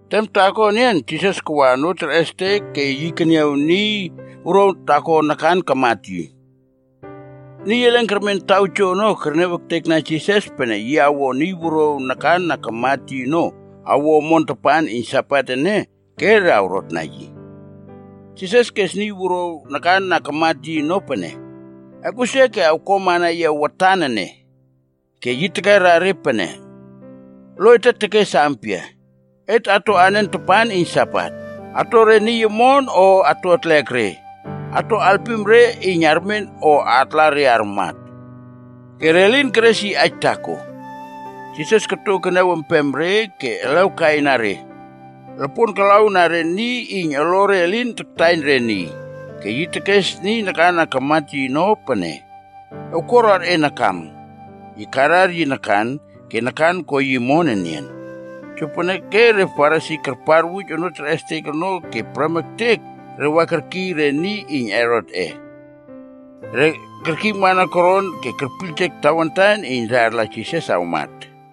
Tem taako enian Jisas kawa onoo terꞌestek ke yi keniaw niy wuruaw taako nakan kamat yi. Niy elen kermen taw joono kerniaw ektekna Jisas pene yi awo niy wuruaw nakan na kamat yi ono awo omon tapan iyn Sabat ene, ke re awrotna yi. Jisas kes niy wuruaw nakan na kamat yi ono pene, “Ekꞌusia ke awkuamana yia watan ene.” Ke yi tekera re pene, “Lo ete tekes ampia? Et atoꞌen tapan iyn Sabat? Ato re niy omon o ato atlek re? Ato alpim re iyn armen o atla re armat?” Ke re lin keres yi aij taako. Jisas koto keniawempem re ke elew kai na re. Lopon kalaw na re niy iyn olore elin taktaiyn re niy. Ke yi tekes niy nakan na kamat yi ono pene, “Ewkuaruar e nakam.” Yi karar yi nakan, ke nakan ko yi omon enian. Jopeneke re Farisi karparwuj onoo terꞌestek ono ke prem ektek re wa kerkiy re niy iyn Herotꞌe. Re kerkiymana koron ke kerpiyljek tawantan iyn re arla Jisas awmat.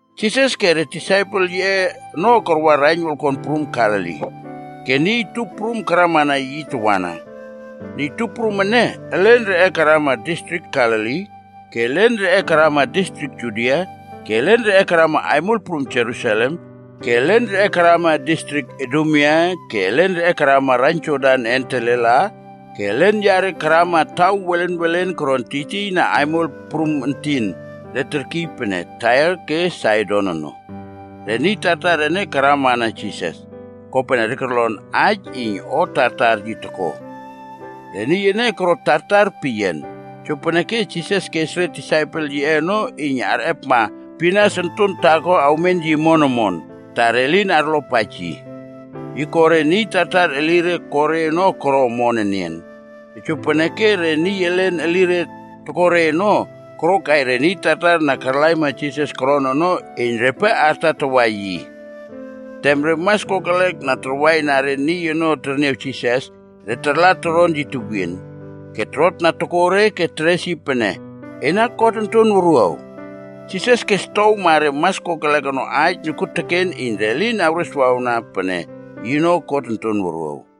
Jisas ke re disaipel yiꞌe ono karwa raiyn wolkon prum Galili. Ke niy tup prum karwanan yi tawana. Niy tup prum ene, elen reꞌe karama distrik Galili, ke elen reꞌe karama distrik Judia, ke elen karama aimol prum Jerusalem ke elen karama distrik Idumea ke elen karama raiyn Jordan een telela, ke elen yare karama taw welen welen koron tiytiyna aimol prum entin, re terkiy pene Tair ke Saidon ono. Re niy tartar ene karamana Jisas, kopene re korlon aij iyn o tartar yi toko. Re niy ene koro tartar peyian. Jopeneke Jisas kes re disaipel yiꞌe ono iyn arꞌepma pinas onton taako awmen yi omon omon, ta re elin arlopaij yi. Yi ko re niy tartar elire ko re ono koro omon enian. Tojopeneke re niy elen elire toko re ono, korokai re niy tartar na karlaima Jisas koron ono iyn repe artatawa yi. Tem re mas kokelek na tarwaina re niy ono terniaw Jisas, re tarla toron yi tewien, ke torotna tokore ke teres yi pene, “Ena God Onton Wuruaw!” Jisas kestowma re mas kokelek ono aij nokuoteken iyn re lin awreswawna pene yino God Onton Wuruaw.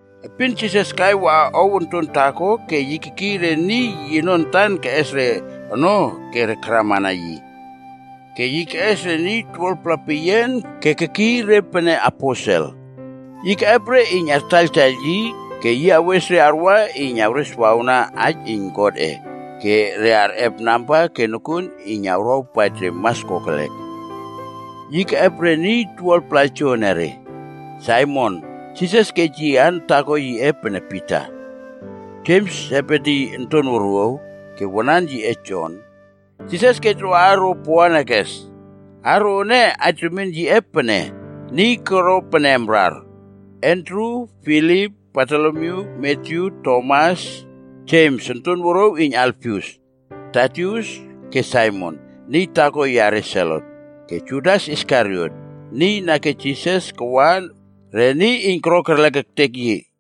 Epin Jisas kai waꞌa ow onton taako ke yi kekiy re niy yino antan keꞌes re ono ke re karamana yi. Ke yi keꞌes niy 12-pla peyian ke kekiy re pene “aposel.” Yi keꞌep re iyn re artaiyltaiyl yi, ke yi awes re arwa iyn awreswawna aij iyn Godꞌe, ke re arꞌep namba ke nokuon iyn awrawpaij re mas kokelek. Yi keꞌep re niy 12-pla joenere. Saimon (Jisas kej yi aan taako yiꞌe Pita), Jems, Sebedi onton wuruaw, ke wanan yiꞌe Jon, Jisas kej ro aaro “Boanerges.” Aaro ene aij remien yiꞌe pene, niy koro pene amrar. Andru, Filip, Bartolomyu, Matyu, Tomas, Jems onton wuruaw iyn Alfius, Tadius, ke Saimon, niy taako yare Selot, ke Judas Iskariot, niy na kej Jisas kawa re niy iyn koro kerlek ektek yi.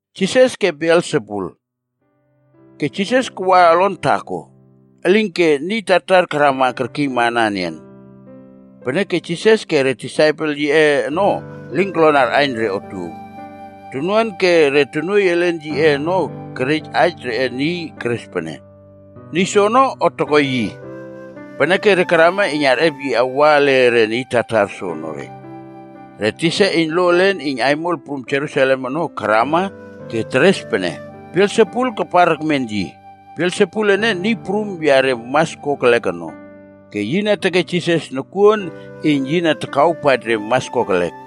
Ke Jisas kawa olon taako, elinke niy tartar karama kerkiymana enian. Peneke Jisas ke re disaipel yiꞌe ono elin korlon arꞌaiyn re otuow. Tonuan ke re tonuoiy elen yiꞌe ono kerej aij reꞌe niy keres pene, “Niy soono, o toko yi.” Peneke re karama iyn arꞌep yi awa ele re niy tartar soonore. Re tisa iyn lo elen iyn aimol prum Jerusalem ono karama ke teres pene, “Belsebul kapar ekmen yi. Belsebul ene niy prum yare mas kokelek ono, ke yi na tekej Jisas nokuon iyn yi na takawpaij re mas kokelek.”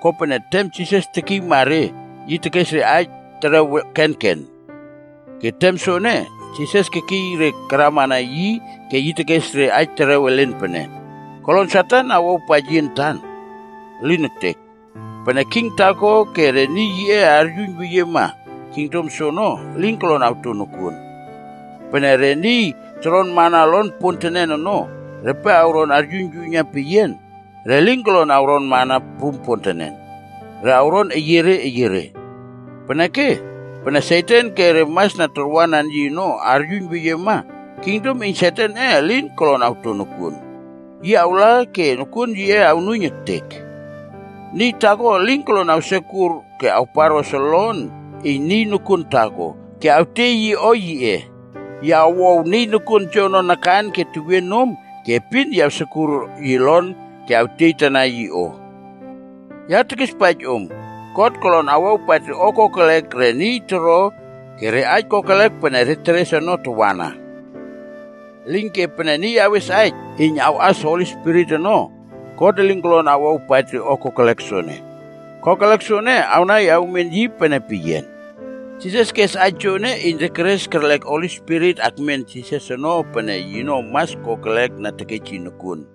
Kopene tem Jisas tekiyma re, yi tekes re aij terew kenken. Ke tem soene, Jisas kekiy re karamana yi ke yi tekes re aij terew elen pene, “Kolon Satan awawpaij yi antan? Elin ektek! Pene king taako ke re niy yiꞌe aryuiyn weyiema, kingdom soono elin kolon awto nokuon. Pene re niy toronmana olon pontenen ono, repe awron aryuiynyuiyna peyian, re lin kolon awronmana prum pontenen, re awron eyiere eyiere. Peneke, pene Satan ke re mas na tarwanan yi ono aryuiyn weyiema, kingdom iyn Satanꞌe elin kolon awto nokuon. Yi awla ke nokuon yiꞌe awnuiyn ektek.” “Niy taakoa elin kolon awsekur ke awparꞌos olon iyn niy nokuon taako ke awtiey yi o yiꞌe. Yi awow niy nokuon joono nakan ke tewien nom ke epin yi awsekur yi olon ke yi awtieytana yi o. “Ya tekispaij om, God kolon awawpaij re o kokelek re niy toro ke re aij kokelek pene re teres ono tawana. Elinke, pene niy awes aij iyn awꞌas Holi Spirit ono, God elin kolon awawpaij o kokelek soene. Kokelek soene, awnai awmen yi pene peyian.” Jisas kes aij joene, kopene re karꞌas Holi Spirit akmen yi ono, pene mas kokelek iyn tekej yi nokuon.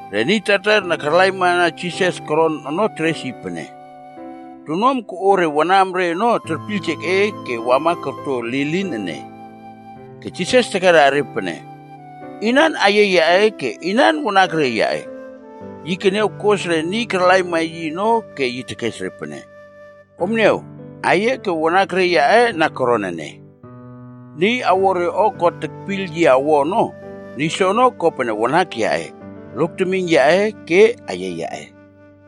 Re niy tartar na karlaimana Jisas koron ono teres yi pene “Tonuam koꞌo re wanamre ono terpiyljek e ke wama korto lilin ene.” Ke Jisas tekerna re pene, “Inan aiyia yaꞌe ke inan wanakre yaꞌe?” Yi keniaw kos re niy karlaimana yi ono ke yi tekes re, “Om niaw aiyia ke wanakre yaꞌe na koron ene. Niy awo re o God tekpiyl yi awo ono, niy soono ko pene wanak yaꞌe, lok temiyn yaꞌe ke aiyia yaꞌe.”